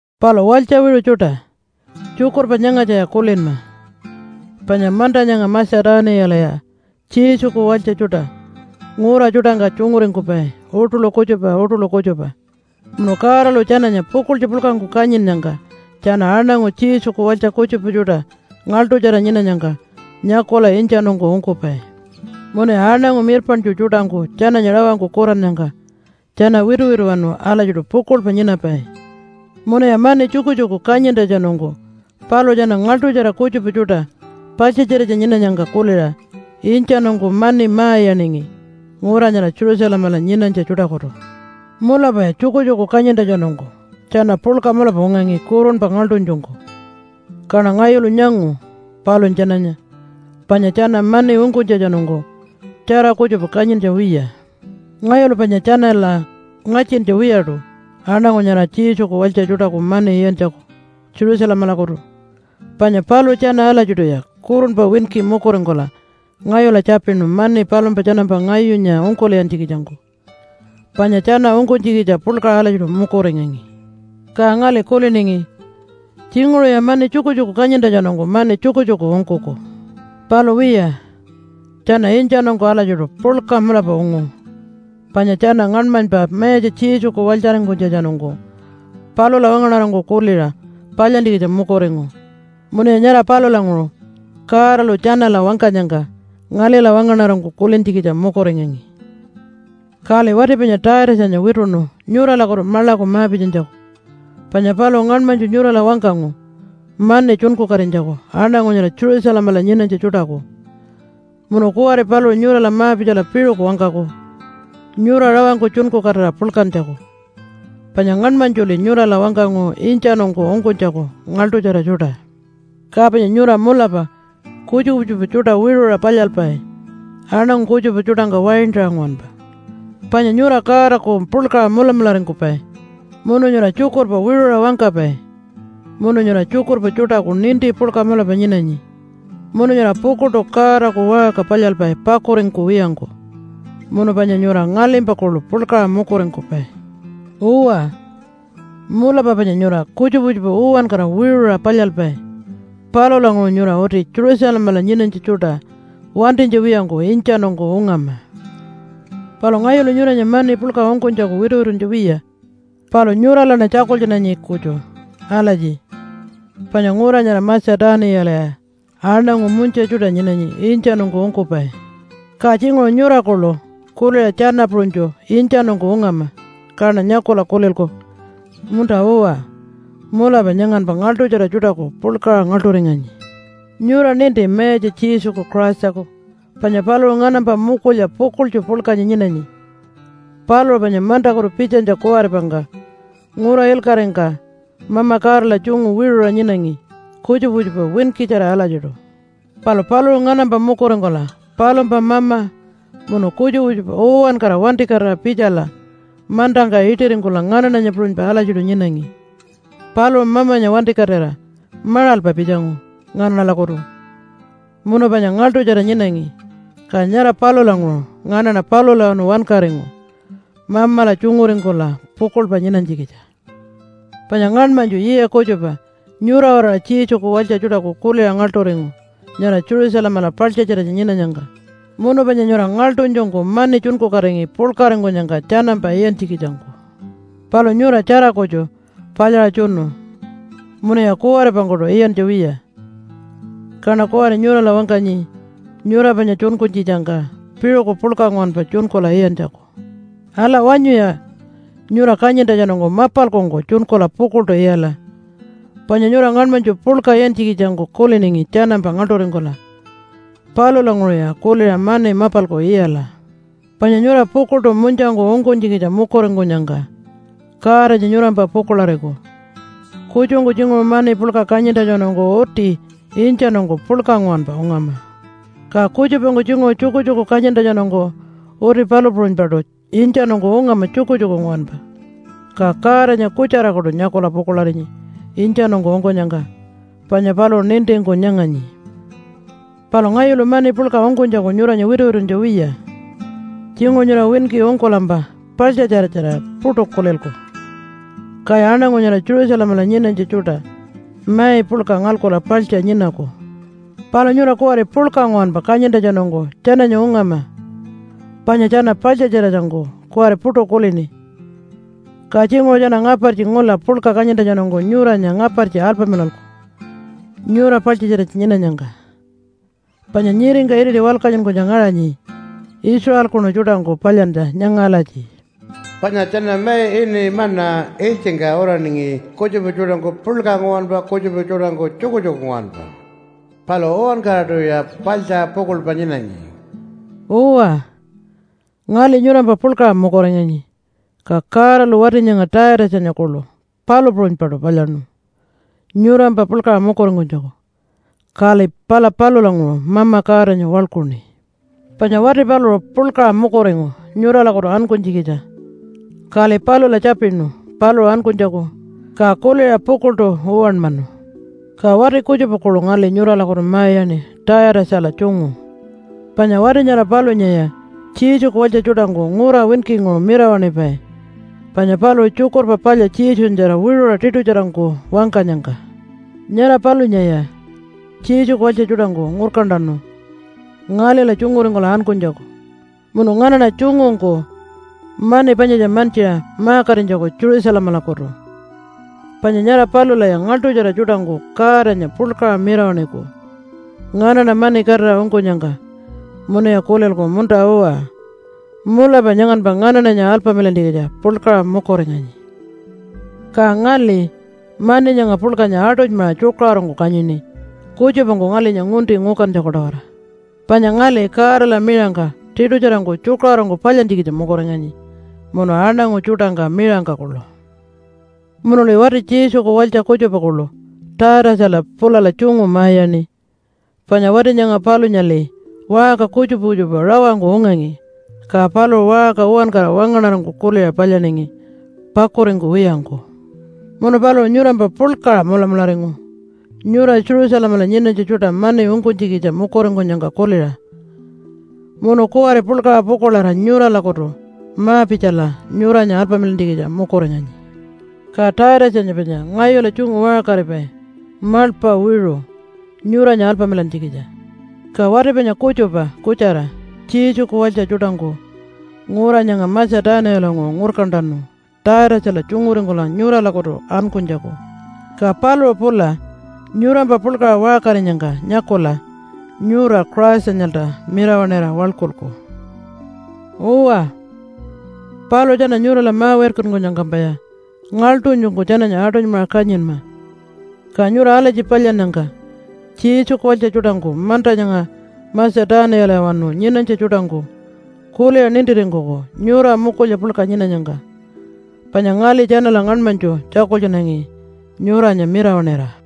Palu walytja wiṟu tjuṯa! Tjukurpa nyangatjaya kulinma! Panya manta nyanga Matja-tuniyalaya Jesuku walytja tjuṯa ngura tjuṯangka tjunguringkupai uṯuḻu kutjupa uṯuḻu kutjupa. Munu Godalu tjananya pukuḻtju puḻkangku kanyinnyangka tjana aṉangu Jesuku walytja kutjupa tjuṯa ngaḻṯutjara nyinanyangka nyakula intjanungku ungkupai. Munuya aṉangu mirpaṉtju tjuṯangku tjananya rawangku kurannyangka tjana wituwituwanu alatjiṯu pukuḻpa nyinapai, munuya mani tjukutjuku kanyintjatjanungku paluṟu tjana ngaḻṯutjara kutjupa tjuṯa paḻtjatjiratja nyinanyangka kuliṟa intjanungku mani ma-iyaningi ngura nyara Jerusalemala nyinanytja tjuṯakutu. Mulapaya tjukutjuku kanyintjatjanungku tjana puḻka mulapa ungangi kurunpa ngaḻṯunytjungku, kaṉa ngayulu nyangu palunya tjananya, panya tjana mani ungkunytjatjanungku tjara kutjupa kanyintja wiya. Ngayulu panya tjanala ngatjintja wiyaṯu aṉangu nyara Jesuku walytja tjuṯaku mani iyantjaku Jerusalemalakutu, panya paluṟu tjana alatjiṯuya kurunpa winki mukuringkula ngayula tjapinu mani palumpa tjanampa ngayunya ungkul'iyantjikitjangku. Panya tjana ungkunytjikitja puḻkaṟa alatjiṯu mukuringangi. Ka ngali kuliningi, “Tjinguṟuya mani tjukutjuku kanyintjatjanungku mani tjukutjuku ungkuku.” Palu wiya, tjana intjanungku alatjiṯu puḻka mulapa ungu. Panya tjana ngaṉmanypa Mayatja Jesuku walytjaringkunytjatjanungku palula wangaṉarangku kuliṟa palyantjikitja mukuringu. Munuya nyara palulanguṟu Godalu tjanala wangkanyangka ngalila wangaṉarangku kulintjikitja mukuringangi. Kali wati panya Taitatjanya wituṉu nyuralakutu maḻaku ma-pitjanytjaku, panya paluṟu ngaṉmanytju nyurala wangkangu mani tjunkukatinytjaku aṉangu nyara Jerusalemala nyinanytja tjuṯaku. Munu kuwari paluṟu nyurala ma-pitjala piṟuku wangkaku nyura rawangku tjunkukatira puḻkantjaku. Panya ngaṉmanytjuli nyurala wangkangu intjanungku ungkunytjaku ngaḻṯutjara tjuṯa. Ka panya nyura mulapa kutjupa kutjupa tjuṯa wiṟuṟa palyalpai aṉangu kutjupa tjuṯangka waintaṟa nguwanpa, panya nyura Godaku puḻkaṟa mulamularingkupai, munu nyura tjukurpa wiṟuṟa wangkapai, munu nyura tjukurpa tjuṯaku ninti puḻka mulapa nyinanyi, munu nyura pukuḻṯu Godaku waṟka palyalpai pakuringkuwiyangku, munu panya nyura ngalimpa kuḻu puḻkaṟa mukuringkupai. Uwa, mulapa panya nyura kutjupa kutjupa uwankara wiṟuṟa palyalpai. Palulanguṟu nyura uti Jerusalemala nyinanytja tjuṯa wantinytja wiyangku intjanungku ungama. Palu ngayulu nyuranya mani puḻka ungkunytjaku wituwituntja wiya, palu nyuralaṉa tjakultjunanyi kutju alatji panya ngura nyara Matja-tuniyalaya aṉangu munytja tjuṯa nyinanyi intjanungku ungkupai. Ka tjinguṟu nyura kuḻu kuliṟa tjana puṟunytju intjanungku ungama, kaṉa nyakula kulilku, “Munta-uwa! Mulapa nyanganpa ngaḻṯutjara tjuṯaku puḻkaṟa ngaḻṯuringanyi.” Nyura ninti Mayatja Jesuku Christaku panya paluṟu nganampa mukulya pukuḻtju puḻkanya nyinanyi. Paluṟu panya mantakutu pitjanytja kuwaripangka ngura ilkaṟingka Mama Godala tjungu wiṟuṟa nyinangi kutjupa kutjupa winkitjara alatjiṯu. Palu paluṟu nganampa mukuringkula palumpa mama munu kutjupa kutjupa uwankara wantikatira pitjala mantangka iṯiringkula nganaṉanya puṟunypa alatjiṯu nyinangi. Paluṟu Mamanya wantikatira maṟalpa pitjangu nganaṉalakutu munu panya ngaḻṯutjara nyinangi, ka nyara palulanguṟu nganaṉa palulawanu wankaringu Mamala tjunguringkula pukuḻpa nyinanytjikitja. Panya ngaṉmanytju yiya kutjupa nyura-waraṟa Jesuku walytja tjuṯaku kuliṟa ngaḻṯuringu nyara Jerusalemala paḻtjatjiratja nyinanyangka. Munu panya nyura ngaḻṯunytjungku mani tjunkukatingi puḻkaringkunyangka tjanampa iyantjikitjangku. Palu nyura tjara kutju palyaṟa tjunu munuya kuwaripangkuṯu iyantja wiya. Kaṉa kuwari nyurala wangkanyi nyura panya tjunkunytjitjangka piṟuku puḻka nguwanpa tjunkula iyantjaku. Ala! Wanyuya nyura kanyintjatjanungku mapalkungku tjunkula pukuḻṯu iyala, panya nyura ngaṉmanytju puḻka iyantjikitjangku kuliningi tjanampa ngaḻṯuringkula. Palulanguṟuya kuliṟa mani mapalku iyala. Panya nyura pukuḻṯu munytjangku ungkunytjikitja mukuringkunyangka Godanya nyurampa pukuḻariku. Kutjungku tjinguṟu mani puḻka kanyintjatjanungku uti intjanungku puḻka nguwanpa ungama. Ka kutjupangku tjinguṟu tjukutjuku kanyintjatjanungku uti palu puṟunypaṯu intjanungku ungama tjukutjuku nguwanpa, ka Godanya kutjarakuṯu nyakula pukuḻarinyi intjanungku ungkunyangka, panya paluṟu nintingku nyanganyi. Palu ngayulu mani puḻka ungkunytjaku nyuranya wituwituntja wiya. Tjinguṟu nyura winki ungkulampa paḻtjatjiratjarira puṯu kulilku, kaya aṉangu nyara Jerusalemala nyinanytja tjuṯa mai puḻka ngalkula paḻtja nyinaku. Palu nyura kuwari puḻka nguwanpa kanyintjatjanungku tjananya ungama, panya tjana paḻtjatjiratjangku kuwari puṯu kulini. Ka tjinguṟu tjana ngapartji ngula puḻka kanyintjatjanungku nyuranya ngapartji alpamilalku nyura paḻtjatjiratja nyinanyangka. Panya nyiringka iriti walkatjunkunytja ngaṟanyi Israelkunu tjuṯangku palyantja nyanga alatji, “Panya tjana mai ini ‘manna’ ilytjingka uraningi kutjupa tjuṯangku puḻka nguwanpa, kutjupa tjuṯangku tjukutjuku nguwanpa. Palu uwankaraṯuya paḻtja pukuḻpa nyinangi.” Uwa, ngali nyurampa puḻkaṟa mukuringanyi, ka Godalu wati nyanga Taitatjanya kuḻu palu puṟunypaṯu palyaṉu nyurampa puḻkaṟa mukuringkunytjaku. Kali pala palulanguṟu Mama Godanya waḻkuṉi. Panya wati paluṟu puḻkaṟa mukuringu nyuralakutu ankunytjikitja, kali palula tjapinu paluṟu ankunytjaku, ka kuliṟa pukuḻṯu uwanmanu. Ka wati kutjupa kuḻu ngali nyuralakutu ma-iyaṉi Taitatjala tjungu. Panya wati nyara palunyaya Jesuku walytja tjuṯangku ngura winkinguṟu mirawaṉipai, panya paluṟu Tjukurpa Palya Jesunyatjara wiṟuṟa tiṯutjarangku wangkanyangka. Nyara palunyaya Jesuku walytja tjuṯangku ngurkantanu ngalila tjunguringkula ankunytjaku munu nganaṉa tjungungku mani panyatja mantjiṟa ma-katinytjaku Jerusalemalakutu. Panya nyara palulaya ngaḻṯutjara tjuṯangku Godanya puḻkaṟa mirawaṉiku nganaṉa mani katira ungkunyangka munuya kulilku, “Munta-uwa, mulapa nyanganpa nganaṉanya alpamilantjikitja puḻkaṟa mukuringanyi.” Ka ngali mani nyanga puḻkanya aṯunymaṟa tjukaṟurungku kanyini kutjupangku ngalinya ngunti ngukantjaku-tawara. Panya ngali Godala miṟangka tiṯutjarangku tjukaṟurungku palyantjikitja mukuringanyi munu aṉangu tjuṯangka miṟangka kuḻu. Munuli wati Jesuku walytja kutjupa kuḻu Taitatjala pulala tjungu ma-iyaṉi. Panya wati nyanga palunyali waṟka kutjupa kutjupa rawangku ungangi, ka paluṟu waṟka uwankara wangaṉarangku kuliṟa palyaningi pakuringkuwiyangku. Munu paluṟu nyurampa puḻkaṟa mulamularingu nyura Jerusalemala nyinanytja tjuṯa mani ungkunytjikitja mukuringkunyangka kuliṟa, munu kuwari puḻkaṟa pukuḻarira nyuralakutu ma-pitjala nyuranya alpamilantjikitja mukuringanyi. Ka Taitatjanya panya ngayula tjungu waṟkaripai maḻpa wiṟu nyuranya alpamilantjikitja. Ka wati panya kutjupa kutjara Jesuku walytja tjuṯangku ngura nyanga Matja-tuniyalanguṟu ngurkantanu Taitatjala tjunguringkula nyuralakutu ankunytjaku. Ka paluṟu pula nyurampa puḻkaṟa waṟkarinyangka nyakula nyura Christanyalta mirawaṉira waḻkulku. Uwa, paluṟu tjana nyurala ma-wirkankunyangkampaya ngaḻṯunytjungku tjananya aṯunymaṟa kanyinma. Ka nyura alatji palyannyangka Jesuku walytja tjuṯangku manta nyanga Matja-tuniyalawanu nyinanytja tjuṯangku kuliṟa nintiringkuku nyura mukulya puḻka nyinanyangka, panya ngali tjanala ngaṉmanytju tjakultjunangi nyuranya mirawaṉira.